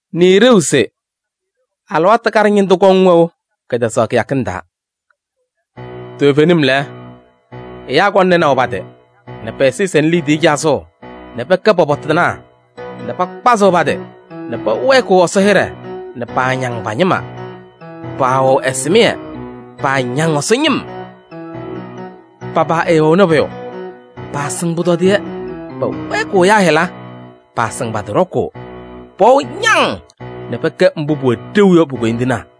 Nɩɩ ɖeu se: alɩwaatʋ kaɖɛ ñɩndʋ kɔŋ wɛʋ kɛtɛzaɣ kɩyakɩŋ taa. Toovenim lɛ, ɛyaa kɔŋ nɩnaʋ pa-tɩ nɛ pɛ-ɛzɩyɛ sɛnɩ liidiye cazʋʋ nɛ pɛkɛ pɔpɔtɩnaa nɛ pakpazɩɣ pa-tɩ nɛ pɛwɛɛkɩɣ Ɛsɔ hɩɖɛ nɛ paañaŋ pa-ñɩma, paawɛɣ ɛsɩmɩyɛ, paañaŋ Ɛsɔ ñɩm. Pa-paa ɛɛwɛɣnɩ pʋyʋ, paasɩŋ pʋtɔdɩyɛ, pɛwɛɛkɩɣ ɛyaa hɩla, paasɩŋ pa-tɩ ɖɔkʋʋ, pɛwɛɣ ñaŋ nɛ pɛkɛ mbʋ pʋwɛ ɖeu yɔ pu-koyindinaa.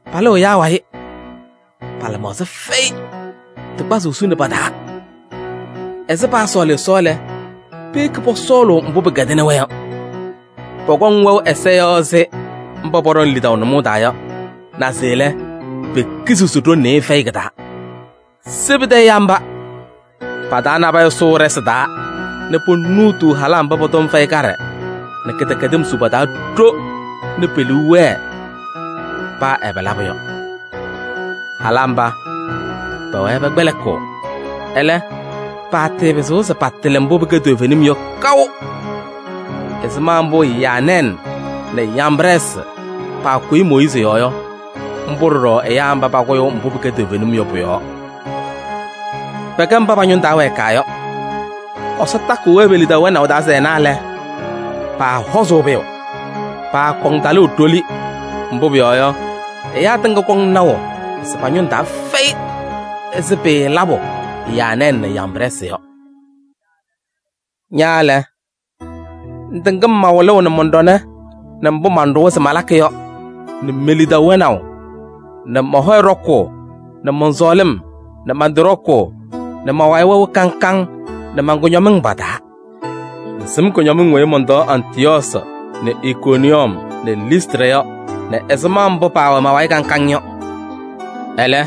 Palɩɣ ɛyaa wayɩ, pa-lɩmaɣza fɛyɩ, tɩ kpazʋʋ suni pa-taa. Ɛzɩ paasɔɔlɩ Ɛsɔ lɛ, peyeki pɔsɔɔlʋʋ mbʋ pɩkɛdɩnɩ-wɛ yɔ. Pɔkɔŋ wɛʋ ɛza yɔɔ ɛzɩ mba pɔɖɔŋ lidaʋ nʋmɔʋ taa yɔ, naze lɛ, pekiziɣ se ɖoŋ nɩɩyɩ fɛyɩ kɩ-taa. Se pɩtɛ ɛyaa mba! Pa-taa nabɛyɛ sʋʋ ɖɩsɩ taa nɛ ponuutuu halaa mba pɔ-tɔm fɛyɩ kaɖɛ nɛ kɩdɛkɛdɩm su pa-taa ɖo nɛ pe-liu wɛɛ paa ɛbɛ labʋ yɔ. Halaa mba, pɛwɛɛ pɛkpɛlɩkɩɣ, ɛlɛ, paatɩɩpɩzɩɣ se patɩlɩ mbʋ pɩkɛ toovenim yɔ kaʋ. Ɛzɩma mbʋ Yaanɛɛsɩ nɛ Yambrɛɛsɩ paakʋyɩ Mooyiizi yɔɔ yɔ, mbʋ ɖɔɖɔ ɛyaa mba pakʋyʋʋ mbʋ pɩkɛ toovenim yɔ pʋ-yɔɔ. Pɛkɛ mba pa-ñʋŋ taa wɛɛkaa yɔ. Ɛsɔ takɩɣ-wɛ pe-lidaʋ wɛnaʋ taa se ɛna lɛ, paahɔzʋʋ pʋyʋ: paakɔŋ talʋʋ ɖoli, mbʋ pʋyɔɔ yɔ, ɛyaa tɩŋa kɔŋ naʋ se pa-ñʋŋ taa fɛyɩ ɛzɩ pɩɩlabʋ Yaanɛɛsɩ nɛ Yambrɛɛsɩ yɔ. Ña lɛ, ŋtɩŋ-m ma-wɩlʋʋ nɛ mɔn-ɖɔnɛ nɛ mbʋ manɖʋwa se malakɩ yɔ nɛ me-lidaʋ wɛnaʋ nɛ mɔ-hɔyɛ ɖɔkʋʋ nɛ mɔn-sɔɔlɩm nɛ man-tɩ ɖɔkʋʋ nɛ ma-wayɩ wɛʋ kaŋ kaŋ nɛ man-kʋñɔmɩŋ pa-taa. Ŋsɩm kʋñɔmɩŋ weyi mɔntɔɔ Antɩyɔɔsɩ nɛ Ikoniyɔm nɛ Listrɩ yɔ nɛ ɛzɩma mbʋ paawɛ ma-wayɩ kaŋ kaŋ yɔ. Ɛlɛ,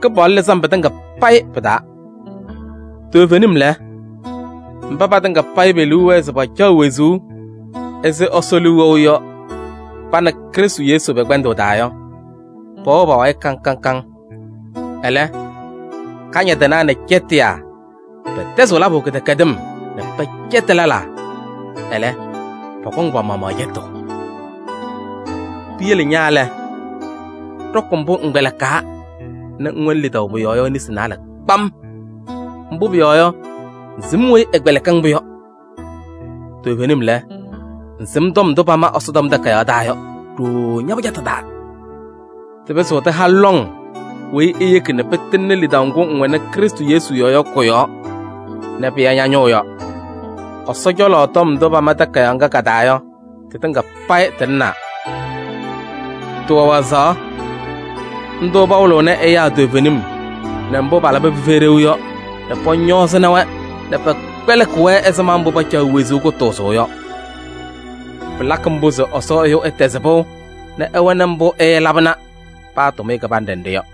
Kɩpaɣlʋ lɩzɩ-m pɩtɩŋa payɩ pɩ-taa. Toovenim lɛ, mba patɩŋa payɩ pe-liu wɛɛ se pacaɣ wezuu ɛzɩ Ɛsɔ liu wɛʋ yɔ pa nɛ Krɩstʋ Yesu pɛ-kpɛndʋʋ taa yɔ, pɛwɛɣ pa-wayɩ kaŋ kaŋ. Ɛlɛ, kañadɩnaa nɛ cɛtɩyaa pɛtɛzɩɣ labʋ kɩdɛkɛdɩm nɛ pɛcɛtɩ lɛlaa, ɛlɛ pɔkɔŋ pa-maɣmaɣ cɛtʋʋ. Piyele ña lɛ, ɖɔkɩ mbʋ ŋkpɛlɩkaa nɛ ŋwɛnɩ lidaʋ pʋ-yɔɔ yɔ nesi naalɛ kpam. Mbʋ pʋyɔɔ yɔ, ŋsɩm weyi ɛkpɛlɩkɩ-ŋ-pʋ yɔ. Toovenim lɛ, ŋsɩm tɔm ndʋ pama Ɛsɔtɔm Takayaɣ taa yɔ ɖooo ña-pɩjatʋ taa. Tɩpɩzɩɣ tɩha-ŋ lɔŋ weyi eyeki nɛ pɩtɩŋnɩ lidaʋ ŋgʋ ŋwɛnɩ Krɩstʋ Yesu yɔɔ yɔ kʋ-yɔɔ nɛ pɩya ña-ñʋʋ yɔ. Ɛsɔ cɔlɔ tɔm ndʋ pama takayaɣ ŋga ka-taa yɔ, tɩtɩŋa payɩ tɩlɩnaa. Tɩwɛ wazaɣ: ndʋ pawɩlɩɣnɩ ɛyaa toovenim nɛ mbʋ palabɩ pɩfɛyɩ ɖeu yɔ nɛ pɔñɔɔzɩ-wɛ nɛ pɛkpɛlɩkɩ-wɛ ɛzɩma mbʋ pacaɣ wezuu kʋtʋʋzʋʋ yɔ. Pɩlakɩ mbʋ se Ɛsɔ ɛyʋ ɛtɛzɩ pɩʋ nɛ ɛwɛnɩ mbʋ ɛɛlabɩnɩ paa tʋmɩyɛ kɩbanɖɛ nɖɩ yɔ.